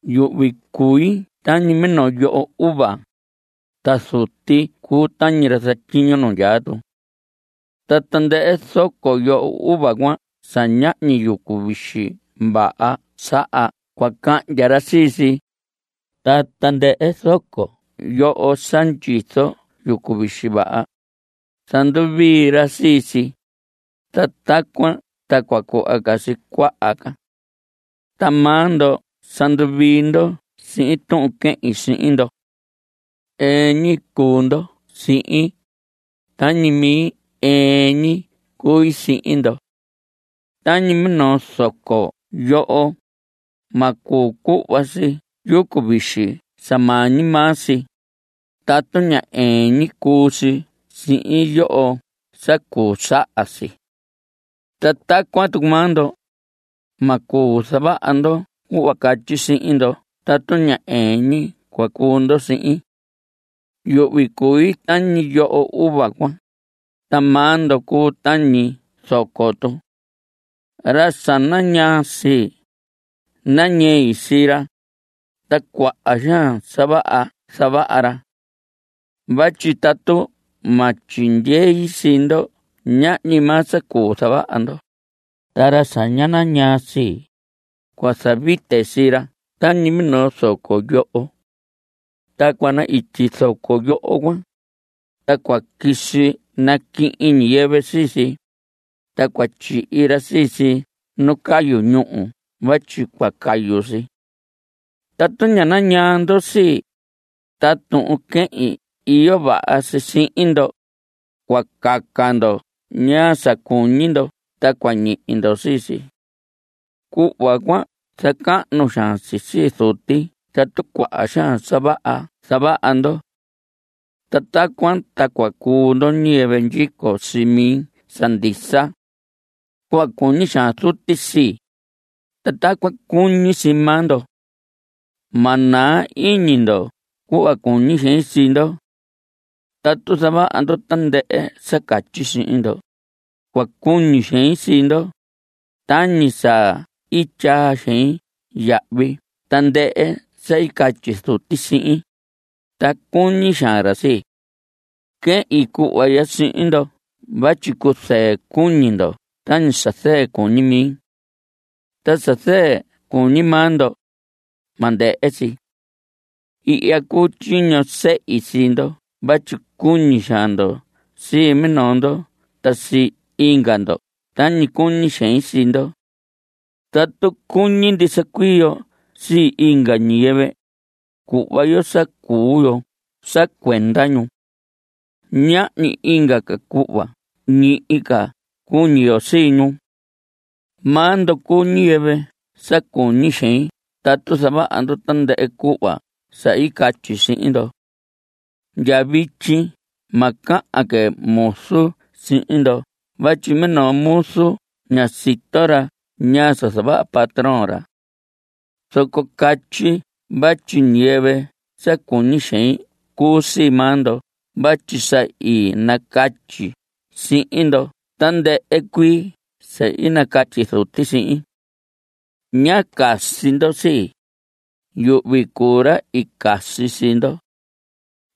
Yuhvi cui tañi minoo yoho uva, ta Zuti cuu tañi ra zatyiño nu ndyaa tu. Ta tandɨhɨ zoco yoho uva cuan sa ñahñi yucu vixi vaha saha cua cahndya ra sii si. Ta tandɨhɨ zoco yoho sa ndyizo yucu vixi vaha, zanduvii ra sii si, ta tacuan ta cua cuhva si cuaha ca. Ta maa ndo sa nduvii ndo sihin tuhun quehin sihin ndo. Ɨɨn ñi cuu ndo sihin. Tañi mi ɨɨn ñi cui sihin ndo. Tañi minoo zoco yoho, ma cuu cuhva si yucu vixi sa maa ñi maa si, tatu ña ɨɨn ñi cuu si sihin yoho sa cuu saha si. Ta tacuan tucu maa ndo; ma cuu zavaha ndo cuhva catyi sihin ndo tatu ña ɨɨn ñi cua cuu ndo sihin. Yuhvi cui tañi yoho uva cuan, ta maa ndo cuu tañi zoco tu. Ra sa nañaa sii, nañei sii ra. Ta cuaha xaan sa vaha zavaha ra. Vatyi tatu ma tyindyei sii ndo ñahñi maa sa cuu zavaha ndo. Ta ra sa ña nañaa sii, cua zavite sii ra tañi minoo zoco yoho. Ta cua na‑ityi zoco yoho cuan, ta cua quisi naquihin ñiyɨvɨ sii si, ta cua tyihi ra sii si nu cayu ñúhu vatyi cua cayu si. Tatu nañaa ndo sii, ta tuhun quehin iyo vaha si sihin ndo, cua caca ndo ñaa sa cuñi ndo ta cua ñihi ndo sii si. Cuhva cuan zacahnu xaan si sii Zuti tatu cuaha xaan sa vaha zavaha ndo. Ta tacuan ta cua cuu ndo ñiyɨvɨ ndyico sii mi sa ndisa. Cuhva cuñi xaan Zuti sii, ta tacuan cuñi sii maa ndo. Ma naa iñi ndo cuhva cuñi xein sii ndo. Tatu zavaha ndo tandɨhɨ sa catyi sihin ndo, cua cuñi xein sii ndo. Tañi sa i tyaa xein yahvi tandɨhɨ sa i catyi Zuti sihin, ta cuñi xaan ra sii. Quehin cuhva ya sihin ndo vatyi cuzɨɨ cuñi ndo tañi sa zɨɨ cuñi mi. Ta sa zɨɨ cuñi maa ndo, ma ndɨhɨ si. Ihya cuu tyiño sehi sii ndo vatyi cuñi xaan ndo sii minoo ndo ta sii inga ndo tañi cuñi xein sii ndo. Tatu cuñi ndisa cuii yo sii inga ñiyɨvɨ, cuhva yo sa cuu yo sa cuenda ñu. Ñahñi inga ca cuhva ñihi ca cuñi yo sii ñu. Maa ndo cuu ñiyɨvɨ sa cuñi xein tatu zavaha ndo tandɨhɨ cuhva sa i catyi sihin ndo. Ndya vityi ma cahan que muzu sihin ndo vatyi minoo muzu ña sito ra ñaa sa zavaha patrón ra. Zoco catyi vatyi ñiyɨvɨ sa cuñi xein cuu sii maa ndo vatyi sa i nacatyi sihin ndo tandɨhɨ cuii sa i nacatyi Zuti sihin. Ñá casi ndo sii. Yuhvi cuu ra i casi sii ndo.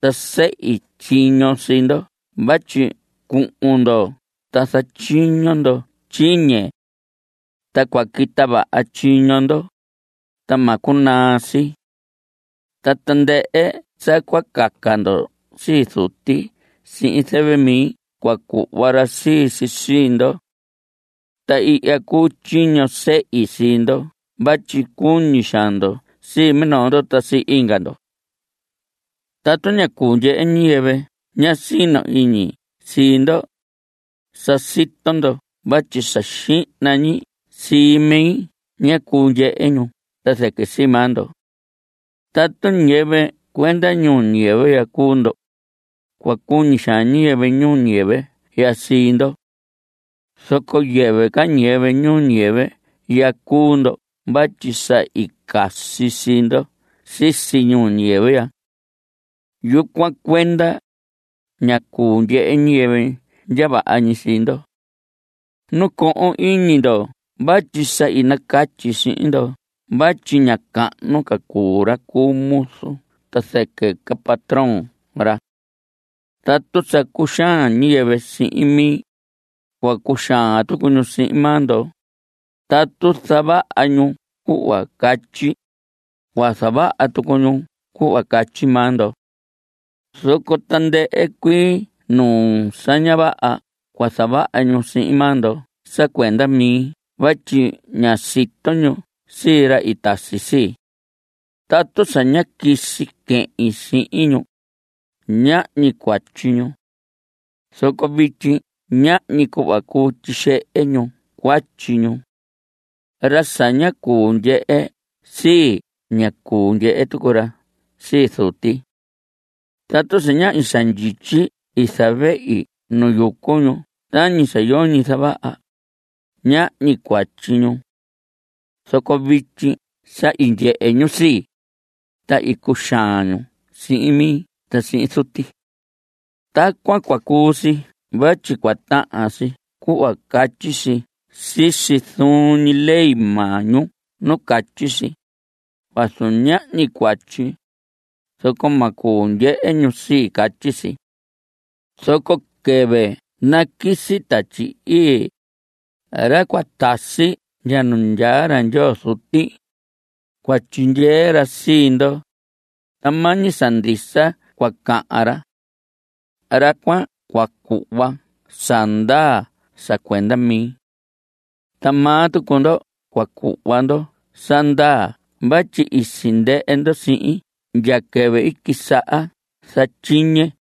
Ta i sehi tyiño sii ndo vatyi cuhun ndo ta zatyiño ndo tyiñe. Ta cua quita vaha tyiño ndo, ta ma cunaa si. Ta tandɨhɨ sa cua caca ndo sii Zuti sihin zɨvɨ mi cua cuhva ra sii si sii ndo. Ta ihya cuu tyiño sehi sii ndo vatyi cuñi xaan ndo sii minoo ndo ta sii inga ndo. Tatu ña cuu ndyehe ñiyɨvɨ ña sino iñi sii ndo, sa sito ndo vatyi sa xihna ñi sii mi ña cuu ndyehe ñu ta zɨquɨ sii maa ndo. Tatu ñiyɨvɨ cuenda ñuu ñiyɨvɨ ya cuu ndo, cua cuñi xaan ñiyɨvɨ ñuu ñiyɨvɨ ya sii ndo. Zoco yɨvɨ ca ñiyɨvɨ ñuu ñiyɨvɨ ya cuu ndo vatyi sa i casi sii ndo sisi ñuu ñiyɨvɨ ya. Yucuan cuenda, ña cuu ndyehe ñiyɨvɨ ndya vaha ñi sii ndo. Nacohon iñi ndo vatyi sa i nacatyi sihin ndo vatyi ña cahnu ca cuu ra cu muzu ta zɨquɨ ca patrón ra. Tatu sa cuxaan ñiyɨvɨ sihin mi, cua cuxaan tucu ñu sihin maa ndo. Tatu zavaha ñu cuhva catyi, cua zavaha tucu ñu cuhva catyi maa ndo. Zoco tandɨhɨ cuii nuu sa ña vaha cua zavaha ñu sihin maa ndo sa cuenda mi vatyi ña sito ñu sii ra i tasi sii. Tatu sa ñá quisi quehin sihin ñu, ñahñi cuatyi ñu. Zoco vityi ñahñi cuhva cuu tyixehe ñu cuatyi ñu. Ra sa ña cuu ndyehe sii, ña cuu ndyehe tucu ra sii Zuti. Tatu sa ñahñi sa ndyityi i zavehi nu yucu ñu tañi sa yoñi zavaha, ñahñi cuatyi ñu. Zoco vityi sa i ndyehe ñu sii, ta i cuxaan ñu sihin mi ta sihin Zuti. Tacuan cua cuu si vatyi cua tahan si cuhva catyi si sisi zuun ñi ley maa ñu nu catyi si: “Vazu ñahñi cuatyi, zoco ma cuu ndyehe ñu sii.” Catyi si. Zoco quɨvɨ naquisi Tatyi Ii, ra cua tasi ndya nu ndyaa ra Ndyoo Zuti, cua tyindyee ra sii ndo, ta maa ñi sa ndisa cua cahan ra. Ra cuan cua cuhva sa ndaa sa cuenda mi. Ta maa tucu ndo cua cuhva ndo sa ndaa vatyi i sindɨhɨ ndo sihin ndya quɨvɨ i quisaha zatyiñe.